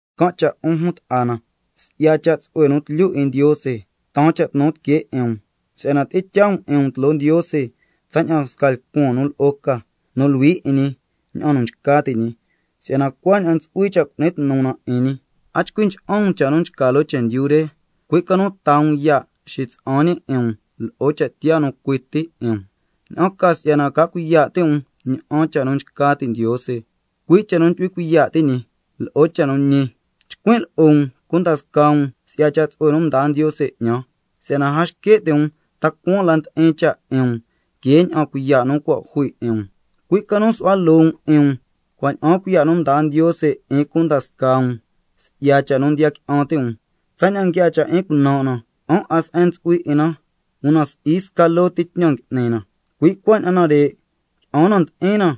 Can' cha' 'un jun ta'a na, si'ya cha' tsu'hue nu tlyu 'in Ndiose, taan cha' tnu tiquee 'in um si'yana tyi'in tyaa um 'in um tloo Ndiose tsaña'an sca lcuan nu lo'o ca, nu luhui 'in ñi, ña'an nu nchca ti' ñi, si'yana cuaña'an ntsu'hui cha' cu'ni tnu na 'in ñi. A chcui ncha'an um cha' nu nchca loo chendyu re, cui' ca nu taa um ya' xitsa'an ñi 'in um lo'o cha' tiyaa nu cui ti, ña'an ca si'yana ca cuiya' ti' um ña'an cha' nu nchca ti' Ndiose, cui' cha' nu ndyu'hui cuiya' ti' ñi, lo'o cha' nu ñi. Chcuin' lo'o um cunda scaa um si'ya cha' tsu'hue nu mdaa Ndiose 'ñan, si'yana a xque' ti' um ta cuaan la ndi'in cha' 'in um que ña'an cuiya' nu cua' jui 'in um, cui' ca nu su'hua loo um 'in um, cua' ña'aan cuiya' nu mdaa Ndiose 'in cunda scaa um si'ya cha' nu ndiya qui'an ti' um. Tsaña'an nguiaa cha' 'in cunan' na, qui'an 'a se'en ntsu'hui 'in na, una si'i sca loo ti tñan ngui'ni na, cui' cuaña'an nare', qui'an na ndi'in na,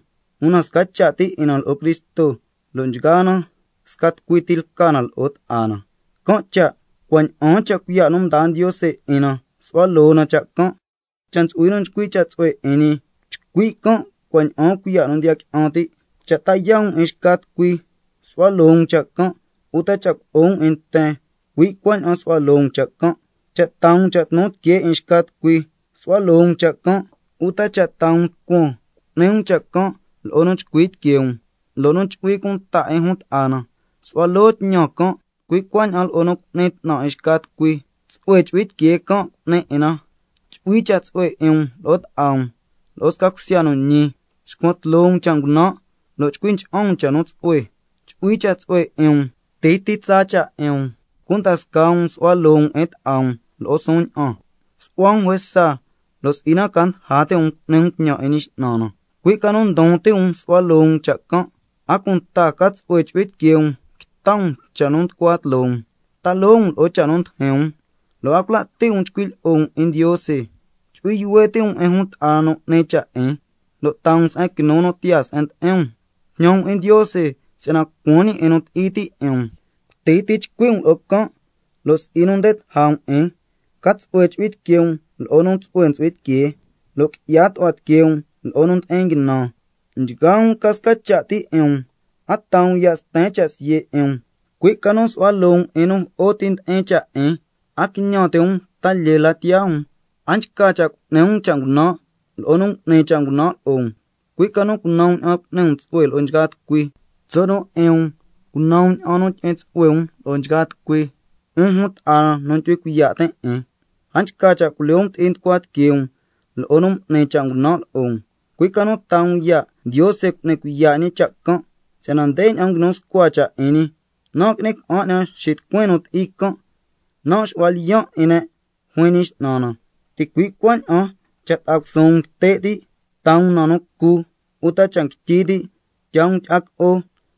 una sca cha' ti 'in na lo'o Cristo, lo' nchgaa na scati tucui lca na lo'o ta'a na. Can' cha', cua' ña'aan cha' cuiya' nu mdaa Ndiose 'in na su'hua loo um cha' can'. Cha' ntsu'hui nu nchcui' cha' tsu'hue 'in ñi, chcui' can' cua' ña'aan cuiya' nu ndiya qui'an ti'. Cha' ta yaa' um 'in xca tucui, su'hua loo um cha' can', uta cha' culo'o um 'in nten, cui' cuaña'an su'hua loo um cha' can'. Cha' taa um cha' tnu tiquee 'in xca tucui, su'hua loo um cha' can', uta cha' taa um lcuan, cu'ni um cha' can' lo'o nu chcui tiquee um, lo' nu chu'hui cunta 'in jun ta'a na, su'hua loo tñan can', cui' cuaña'an lo'o nu cu'ni 'tnan 'in xca tucui, tsu'hue chu'hui tiquee can' cu'ni 'in na. Chu'hui cha' tsu'hue 'in um lo'o ta'a um, lo'o sca cusya nu ñi. Xcuan tloo um cha' ngunan' lo' chcui ncha'an um cha' nu tsu'hue. Chu'hui cha' tsu'hue 'in um, cuti ti tsa cha' 'in um, cunda scaa um su'hua loo um 'in ta'a um lo'o suun ña'an. Su'hua um juesa lo' si'i na ca ndaja ti' um cu'ni um tñan 'in Ñi X'nan na, cui' ca nu ndon ti' um su'hua loo um cha' can'. A cunta ca tsu'hue chu'hui tiquee um quita um cha' nu nducua tloo um, ta loo um lo'o cha' nu ndijin um, lo' a cula' ti' um chcui' lyi'o um 'in Ndiose. Chu'hui yuhue ti' um 'in jun ta'a na nu 'ni cha' 'in, lo' taa um se'en quinu nu tiyaa se'en ndi'in um. Jñan um 'in Ndiose si'yana lcuan ñi 'in nu ti'i ti' 'in um, cuti ti chcui' um lo'o can', lo' si'i nu nde taja um 'in. Ca tsu'hue chu'hui tiquee um lo'o nu tsu'hue ntsu'hui tiquee, lo' qui'ya tu'hua tiquee um lo'o nu ndi'in nguinan. Nchgaa um ca sca cha' ti 'in um, a taa um ya' sten cha' siye' 'in um, cui' ca nu su'hua loo um 'in nu jo'o ti ndi'in cha' 'in, a quiñan ti' um ta lyee la tiyaa um. A nchca cha' cu'ni um cha' ngunan' lo'o nu m'ni cha' ngunan' lo'o um, cui' ca nu cunan um ña'an cu'ni um tsu'hue lo'o nchgaa tucui. Tso' nu 'in um, cunan um ña'an tyi'in um tsu'hue lo'o nchgaa tucui. 'Un jun ta'a na nu ndyu'hui cuiya' tin' 'in, a nchca cha' culyoo um ti'i nducua tiquee um lo'o nu m'ni cha' ngunan' lo'o um, cui' ca nu taa um ya' Ndiose cu'ni cuiya' ñi cha' can', si'yana ndeña'an nguinu scua cha' 'in ñi: —Nan' ngui'ni ca'an 'ñan xitucuin nu ti'i can', nan' xu'huan lyiyan' 'in ne', juin Ñi X'nan na—. Ticui' cuaña'an —cha' ta'a cusuun um nguite' ti', taa um na cu can', uta cha' nguityi ti', tyaa um tyi'a co'o,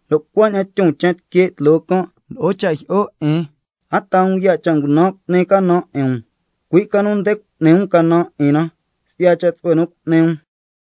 lo' cuaña'an tyon chen tique' tloo can' lo'o cha' jyi'o 'in—. A taa um ya' cha' ngunan' cu'ni canan 'in um, cui' ca nu nde cu'ni um canan 'in na si'ya cha' tsu'hue nu cu'ni um.